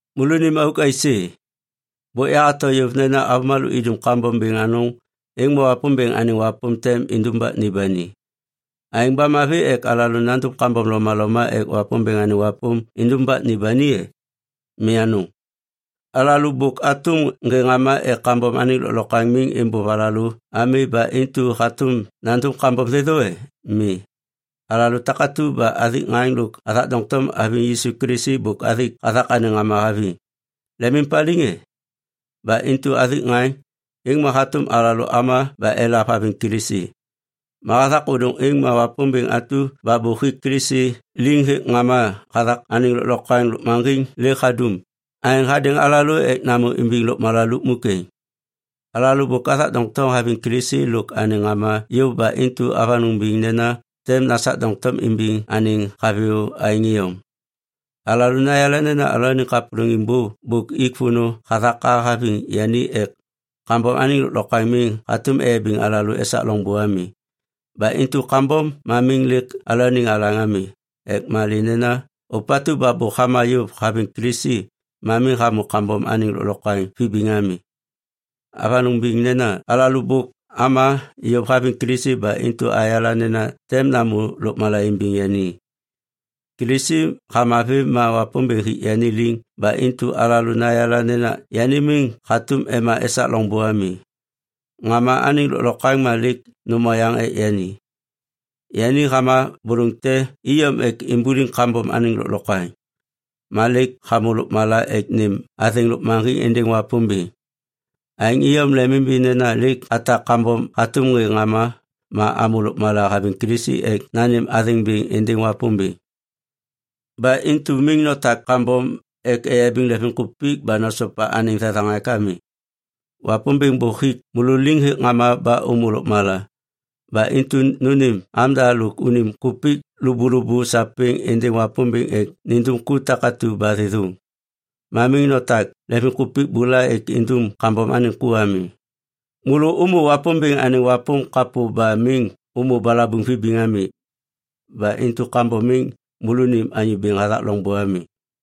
Môlônim auk aisê? Bôk yahato yôv nena avômalô idum kambom bêŋ anôŋ, êŋ ma Wapômbêŋ anêŋ wapôm tem indumbak ni ba ni. Aêŋ ba mavi ek alalô nandum kambom lomaloma ek Wapômbêŋ anêŋ wapôm indumbak ni ba ni e? Mi anôŋ! Alalô bôk atôm ŋê ŋama ek kambom anêŋ lôklokwaŋ miŋ êmbôv alalô ami ba intu hatôm nandum kambom thêthô e? Mi. Alalô takatu ba athik ŋaŋ lôk athak doŋtom haviŋ Yisu Kilisi bôk athik hathak anêŋ ŋama haviŋ. Lemimpaliŋ e? Ba intu athik ŋaŋ, êŋ ma hatôm alalô ama ba elav haviŋ Kilisi. Ma hathak ôdôŋ êŋ ma Wapômbêŋ atu ba bôk hik Kilisi liŋ hêk ŋama hathak anêŋ lôklokwaŋ lôkmaŋgiŋ lêk hadum aêŋ hadêŋ alalô ek namô imbiŋ lôkmala lukmuk êŋ. Alalô bôk athak doŋtom aviŋ Kilisi lôk anêŋ ŋama yôv ba intu avanôŋ biŋ nena tem nasak doŋtom imbiŋ anêŋ haviyô aêŋ iyom. Alalô nayala nena alalôaniŋ kapôlôŋiŋ bô bôk ik vônô hathak a haviŋ yani ek kambom anêŋ lôklokwaŋ miŋ hatôm eyabiŋ alalô esak loŋbô ami. Ba intu kambom ma miŋ lêk alalôaniŋ alaŋ ami. Ek malê nena ôpatu ba bôk hama yôv haviŋ Kilisi ma miŋ hamô kambom anêŋ lôklokwaŋ vibiŋ ami. Avanôŋ biŋ nena alalô bôk ama yôv haviŋ Kilisi ba intu ayala nena tem namô lôkmala imbiŋ yani. Kilisi hama vêm ma Wapômbêŋ hik yani liŋ ba intu alalô nayala nena yani miŋ hatôm ema esak loŋbô ami. Ŋama anêŋ lôklokwaŋ ma lêk nôm oyaŋ ek yani. Yani hama bôlôŋ te iyom ek imbuliŋ kambom anêŋ lôklokwaŋ. Ma lêk hamô lôkmala ek nêm athêŋ lôkmaŋgiŋ êndêŋ Wapômbêŋ. Aêŋ iyom lemimimbi nena lêk atak kambom hatôm ŋê ŋama ma amô lôkmala haviŋ Kilisi ek nanêm athêŋ bêŋ êndêŋ Wapômbêŋ. Ba intu miŋ notak kambom ek eyabiŋ lemvimkupik ba nosopa anêŋ thethaŋak ami. Wapômbêŋ bôk hik môlô liŋ hêk ŋama ba ômô lôkmala. Ba intu nônêm amda lôk unim kupik lôbôlôbô sapêŋ êndêŋ Wapômbêŋ ek nindum ku takatu ba thêthôŋ. Ma miŋ notak lemvimkupik bula ek indum kambom anêŋ ku ami. Môlô ômô Wapômbêŋ anêŋ wapôm kapô ma miŋ ômô balabuŋ vibiŋ ami. Ba intu kambom miŋ môlônim anyô bêŋ hathak loŋbô ami.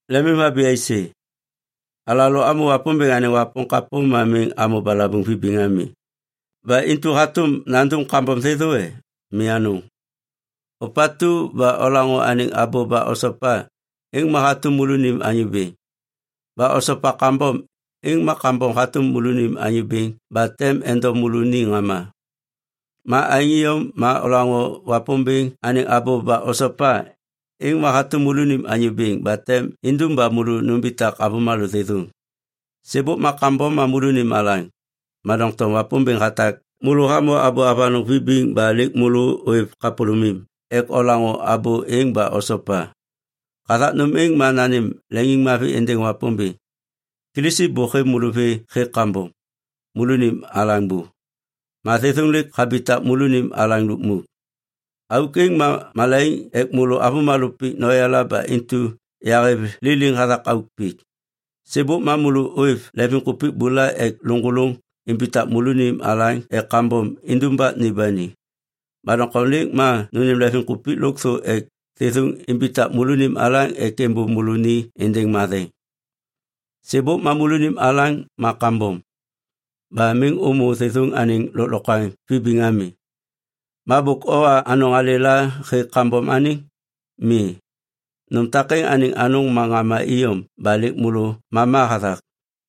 Lemimhabi aisê? Alalô amô Wapômbêŋ anêŋ wapôm kapô ma miŋ amô balabuŋ vibiŋ ami. Ba intu hatôm nandum kambom thêthô e? Mi anôŋ. Ôpatu ba olaŋô anêŋ abô ba osopa, êŋ ma hatôm môlônim anyô bêŋ. Ba osopa kambom, êŋ ma kambom hatôm môlônim anyô bêŋ ba tem endom môlô ni ŋama. Ma aêŋ iyom ma olaŋô Wapômbêŋ anêŋ abô ba osopa, êŋ ma hatôm môlônim anyô bêŋ ba tem indum ba môlô numbitak avômalô thêthôŋ. Sêbôk ma kambom ma môlônim alaŋ, ma doŋtom Wapômbêŋ hatak môlô hamô abô avanôŋ vibiŋ ba lêk môlô ôêv kapôlômim ek olaŋô abô êŋ ba osopa. Hathak nôm êŋ ma nanêm leŋiŋmavi êndêŋ Wapômbêŋ. Kilisi bôk hêv môlô vê hêk kambom, môlônim alaŋ bô. Ma thêthôŋ lêk habitak môlônim alaŋ lukmuk. Auk êŋ ma malaiŋ ek môlô avômalô pik noyala ba intu yahêv liliŋ hathak auk pik. Sêbôk ma môlô ôêv lemvimkupik bula ek lôŋgôlôŋ imbitak môlônim alaŋ ek kambom indumbak ni ba ni. Ma doŋtom lêk ma nônêm lemvimkupik lôkthô ek thêthôŋ imbitak môlônim alaŋ ek êmbôv môlô ni êndêŋ matheŋ. Sêbôk ma môlônim alaŋ ma kambom. Ba miŋ ômô thêthôŋ anêŋ lôklokwaŋ vibiŋ ami. Ma bôk owa anôŋ alêla hêk kambom anêŋ? Mi, nôm takêŋ anêŋ anôŋ ma ŋama iyom ba lêk môlô mama hathak.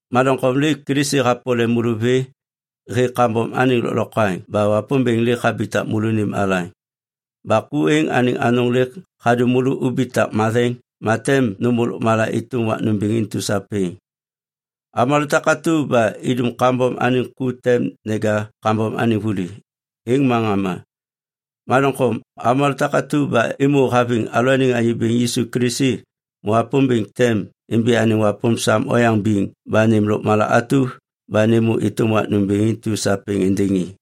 Ma doŋtom lêk Kilisi hapole môlô vê hêk kambom anêŋ lôklokwaŋ ba Wapômbêŋ lêk habitak môlônim alaŋ. Ba ku êŋ anêŋ anôŋ lêk hadum môlô ubitak matheŋ ba tem nômô lôkmala êtôm wak nômbêŋ intu sapêŋ. Avômalô takatu ba idum kambom anêŋ ku tem neja kambom anêŋ vuli, êŋ ma ŋama. Ma doŋtom avômalô takatu ba êmô haviŋ alalôaniŋ Anyô Bêŋ Yisu Kilisi ma Wapômbêŋ tem imbi anêŋ wapôm sam oyaŋ biŋ ba nêm lôkmala atu ba nêmô êtôm wak nômbêŋ intu sapêŋ êndêŋ i.